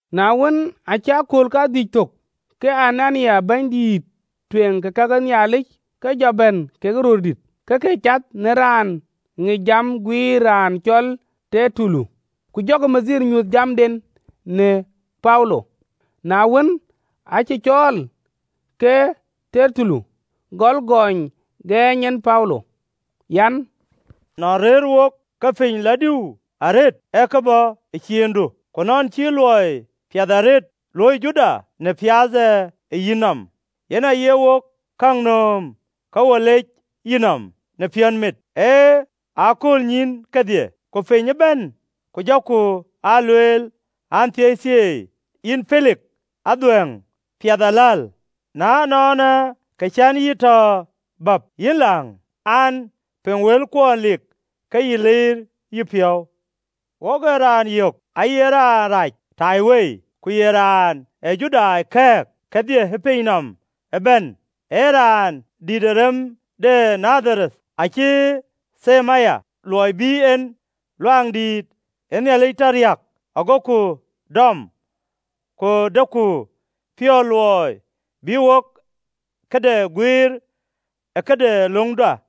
Na wën, aacï akööl kadhïc thök, ke Anania bɛ̈nydïït ë kake Nhialic ke jɔ bɛ̈n kekë röördït, ke ke cath në raan ŋic jam guiir raan cɔl Tertulo. Ku jɔkï bɛ̈ny nyuöth jamden në Paulo. Na wën, aacï cɔɔl, ke Tertulo gɔl gɔny gɔɔny en Paulo an: “Nɔn rëër wok piny lɔ diu arëët, ee kë bɔ̈ ë ciindu, ku në luɔi piɛth arëët luɔi cï luöi jurda në piath ë yïnɔm. Yen aye wok käŋ nööm ke wo lec yïnɔm në piɔ̈nmit, ë aköölnyïïn kedhie ku piny ëbɛ̈n, ku jɔku aa lueel an, Thieithieei, yïn Pelik adhuɛ̈ŋ piɛth aläl. Na ënɔɔnë, kë cän yï tɔ bäp, yïn läŋ an, piŋ wëlkuɔn lik ke yï liir yïpiɔ̈u piny. Wok ë raanë yök aye raan rac ëtaiwei, ku ye raan ë Judai kɛ̈ɛ̈k kedhie ë piny nɔm ëbɛ̈n, ee raan dïït ë rem de Nadharani. Acï them aya luɔi bï en Luaŋdït tɔ riääk. Agoku dɔm, ku deku piɔ̈ɔ̈th luɔi bï wok këde guiir ë këde löŋda.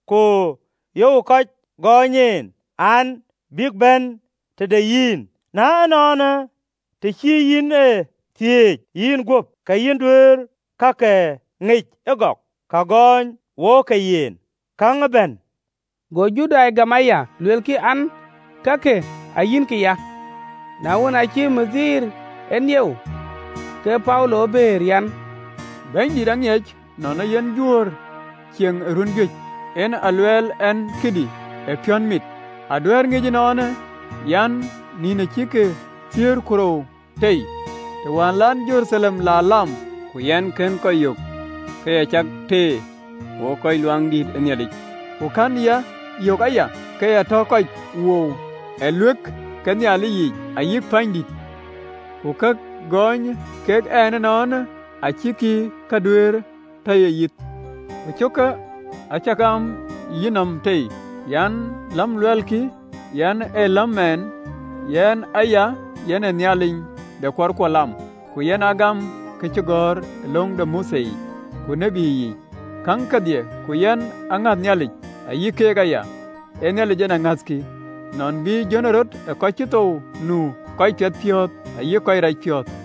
Ku yöök kɔc gɔɔny en an, bïk bɛ̈n tëde yïn, na ënɔɔnë, të cï yïn e thiëëc yïnguöp, ke yïn duëër kakë ŋic ëgɔk, ka gɔɔny wok ke yen, käŋ ëbɛ̈n.” Go Judai gam aya, luelkï an, kakë ayïnkï ya. Na wën, aacï bɛ̈ny e nieu, ke Paulo bëër an, “Bɛ̈nydït, aŋiɛc nɔn ee yïn jurë cieŋ ë run juëc, en a luɛɛl ɛn këdï ë piɔ̈nmit. Aduɛ̈ɛ̈rë ŋic ënɔɔnë, an, nïn acïk thiëër ku rou tei, të wään la yɛn Jeruthalem la lam. Ku yɛn kënë kɔc yök ke ya cak teer wo kɔc ë Luaŋdïtic, ku kënë ya yök aya ke ya tɔ kɔc wou ë ɣööt ke Nhialic yiic, ayï pänydïtic. Ku ka gɔɔny kek ɛn ënɔɔnë, acïkï ke duëër tɔ ye yith. Ku cöökë acä gam ë yïnɔm tei an: Läm luelkï an, ee läm mɛɛn, yen aya yɛn Nhialic de kuarkuɔ lam, ku yɛn gam ka cï gɔ̈ɔ̈r ë löŋ de Mothe yic ku tït yiic, käŋ kedhie. Ku yɛn ŋäth Nhialic, ayï keek aya, ee Nhialic en ŋäthkï, nɔn bï jönërɔt ë kɔc cï thou nu, kɔc piɛthpiɔ̈ɔ̈th ayï kɔc rac piɔ̈ɔ̈th.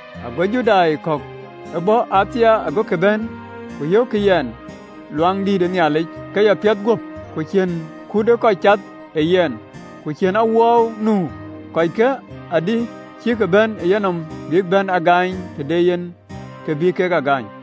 Ago Judai kɔ̈k bɔ̈ Athia agokï bɛ̈n, ku yökkï yɛn ë Luaŋdïtic, ke ya piɛth guöp, ku cïn kut ë kɔc cath ë yɛn, ku cïn awuɔɔu nu. Kɔckë adï cïk bɛ̈n ë yïnɔm, bïk a bɛ̈n gaany, të de yen kë bï kek a gaany.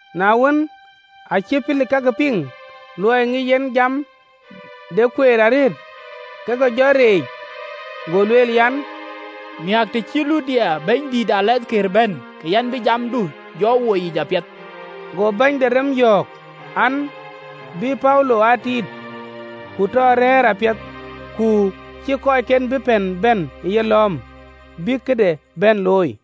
Na wën, aacï Pelik kakë piŋ, luɔi ŋic en jam de Kueer arëët, ke ke jɔ riëëc, go lueel an, “Miäk të cï Luthia bɛ̈nydïït de rem de tɔŋ bɛ̈n, ke yɛn bï jamdun lɔ woi yic apiɛth.” Go bɛ̈ny de rem yɔ̈ɔ̈k an, bï Paulo aa tit, ku tɔ rɛ̈ɛ̈r apiɛth, ku cïï kɔcken bï pɛ̈n bɛ̈n ë yelɔ̈ɔ̈m, bïk këde bɛ̈n looi.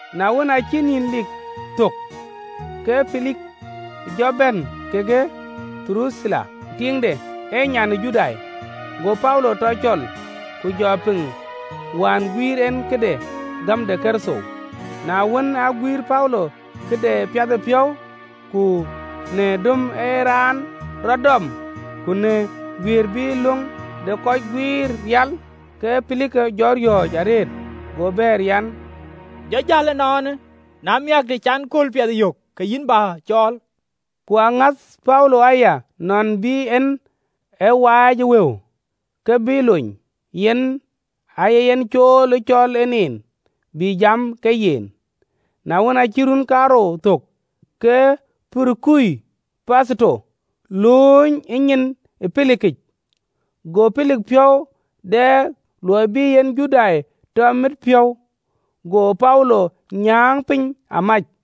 Na wën, aacï nïn lik thök, ke Pelik jɔ bɛ̈n kekë Duruthila tiiŋde, ee nyan ë Judai, go Paulo tɔ cɔl, ku jɔ piŋ wään guiir en këde gäm de Kërtho. Na wën, aguiir Paulo këde piathëpiɔ̈u, ku në döm ee raan rɔt dɔm, ku në guiëër bï löŋ de kɔc guiir rial, ke Pelik jɔ riɔ̈ɔ̈c arëët, go bɛ̈ɛ̈r an, “Jɔ jäl ënɔɔnë. Na miäk, të cän akööl piɛth yök, ke yïn bä cɔɔl.” Ku aŋäth Paulo aya, nɔn bï en ë waac ë wëu, ke bï lony, yen aaye yen cool ë cɔɔl en en, bï jam ke yen. Na wën, aacï run kaarou thök, ke Porukio Petheto lööny ë nyin ë Pelikic, go Pelik piɔ̈u dɛk luɔi bï en Judai tɔ mit piɔ̈ɔ̈th, go Paulo nyääŋ piny amac.